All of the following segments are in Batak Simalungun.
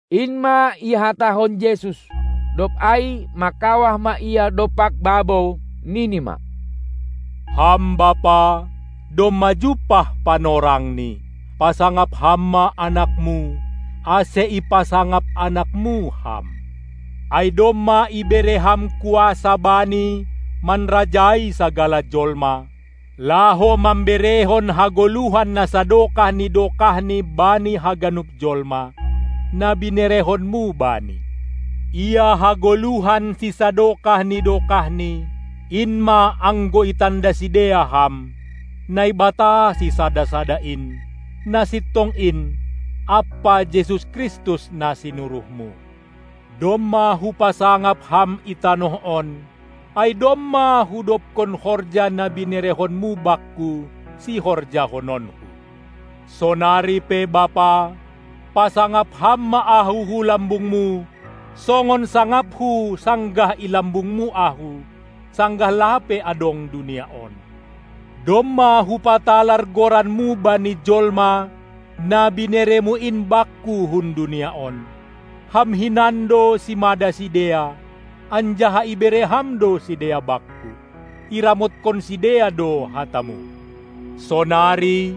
In ma ihatahon Jesus. Dob ai mangkawah ma Ia dompak babou, nini ma: Ham Bapa, domma jumpah panorangni, pasangap Ham ma AnakMu, ase ipasangap AnakMu Ham. Ai domma ibere Ham kuasa Bani manrajai sagala jolma, laho mamberehon hagoluhan na sadokah ni dokahni bani haganup jolma, na binerehonMu Bani. Ia hagoluhan sisadokah ni dokahni, in ma, anggo itanda sidea Ham, Naibata sisada-sada in, na sintong in, ampa Jesus Kristus, na sinuruhMu. Domma Hupasangap Ham i tanoh on, ai domma Hudobkon horja, na binerehonMu Bakku, sihorjahononKu. Sonari pe Bapa, pasangap Ham ma Ahu hu lambungMu, songon sangapHu sanggah i lambungMu Ahu, sanggah lape adong dunia on. Domma Hupatalar GoranMu bani jolma na binereMu in Bakku hun dunia on. Ham hinan do simada sidea, anjaha ibere Ham do sidea Bakku; iramotkon sidea do hataMu. Sonari,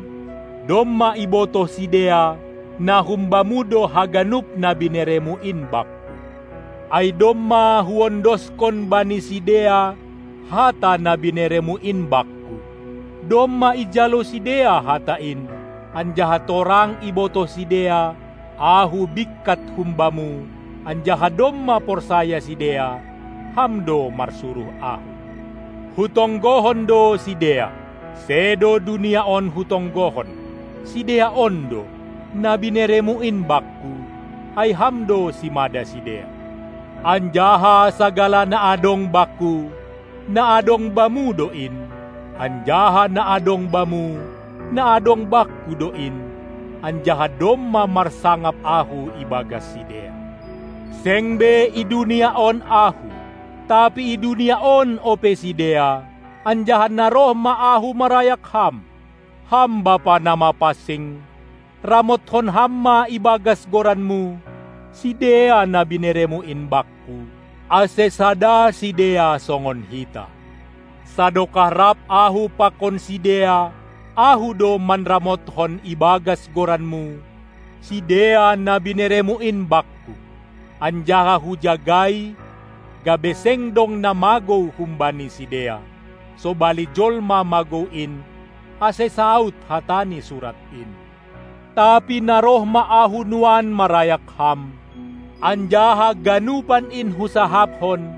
domma ibotoh sidea, na hum Bamu do haganup na binereMu in Bakku. Ai domma Huondoskon bani sidea hata na binereMu in Bakku; domma ijalo sidea hata in, anjaha torang ibotoh sidea Ahu bingkat hum Bamu, anjaha domma porsaya sidea, Ham do marsuruh Ahu. Hutonggohon do sidea. Sedo dunia on Hutonggohon, sidea on do, na bineremu in Bakku, ai Ham do simada sidea. Anjaha sagala na adong Bakku, na adong Bamu do in, anjaha na adong Bamu, na adong Bakku do in, anjaha domma marsangap Ahu ibagas sidea. Seng be i dunia on Ahu, tapi i dunia on ope sidea, anjaha na roh ma Ahu marayak Ham. Ham Bapa na mapansing, ramotkon Ham ma ibagas goranMu, sidea na binereMu in Bakku, ase sada sidea songon Hita. Sadokah rap Ahu pakon sidea, Ahu do manramotkon ibagas goranMu, sidea na binereMu in Bakku, anjaha Hujagai, gabe seng dong na magou humbani sidea, sobali jolma magou in, ase saud hata ni Surat in. Tapi na roh ma Ahu nuan marayak Ham, anjaha ganupan in Husahapkon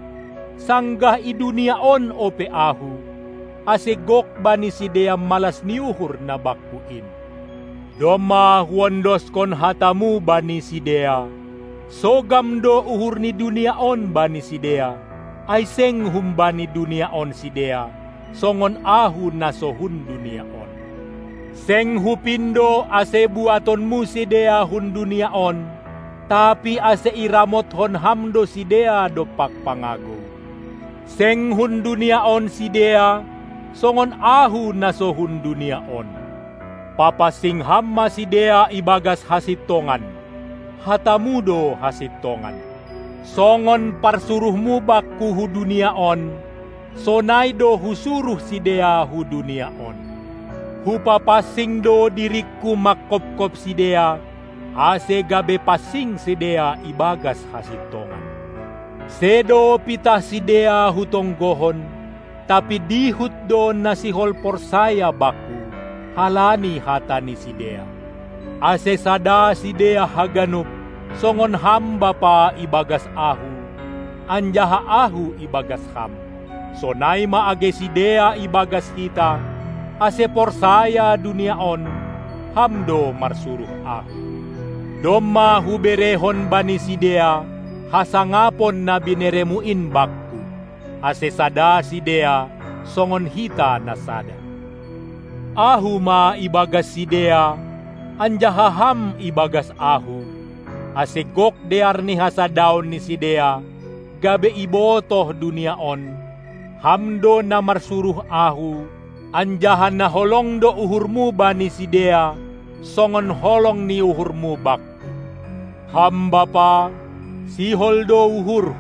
sanggah i dunia on ope Ahu, ase gok bani sidea malas ni uhur na Bakku in. Domma Huondoskon hataMu bani sidea; sogam do uhur ni dunia on bani sidea, ai seng humbani dunia on sidea, songon Ahu na so hun dunia on. Seng Hupindo, ase buatonMu sidea hun dunia on, tapi ase iramotkon Ham do sidea dompak pangagou. Seng hun dunia on sidea, songon Ahu na so hun dunia on. Papansing Ham ma sidea ibagas hasintongan; hataMu do hasintongan. Songon parsuruhMu Bakku hu dunia on, sonai do Husuruh sidea hu dunia on. Hupapansing do diringKu mangkopkop sidea, ase gabe pansing sidea ibagas hasintongan. Sedo pitah sidea Hutonggohon, tapi dihut do na sihol porsaya Bakku, halani hata ni sidea, ase sada sidea haganup, songon Ham Bapa i bagas Ahu, anjaha Ahu i bagas Ham, sonai ma age sidea i bagas Hita, ase porsaya dunia on, Ham do marsuruh Ahu. Domma Huberehon bani sidea hasangapon na binereMu in Bakku, ase sada sidea, songon Hita na sada. Ahu ma ibagas sidea, anjaha Ham i bagas Ahu, ase gok dear ni hasadaon ni sidea, gabe ibotoh dunia on, Ham do na marsuruh Ahu anjaha na holong do uhurMu bani sidea, songon holong ni uhurMu Bakku. Ham Bapa, sihol do uhurHu,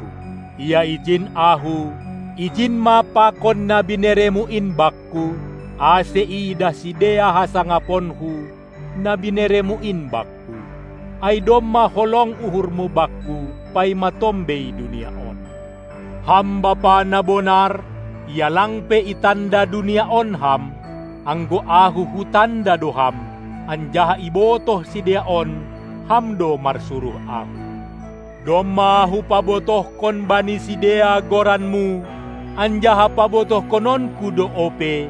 ia ijin Ahu,ijin ma pakon na binereMu in Bakku, ase iidah sidea hasangaponKu, na binereMu in Bakku, ai domma holong uhurMu Bakku, paima tombei dunia on. Ham bapa na bonar, ia lang pe itanda dunia on Ham, anggo Ahu Hutanda do Ham, anjaha ibotoh sidea on, Ham do marsuruh Ahu. Domma Hupabotohkon bani sidea goranMu, anjaha pabotohkononKu do ope,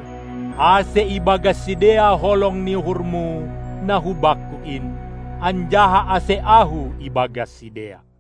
ase i bagas sidea holong ni uhurMu na hu Bakku in, anjaha ase Ahu i bagas sidea.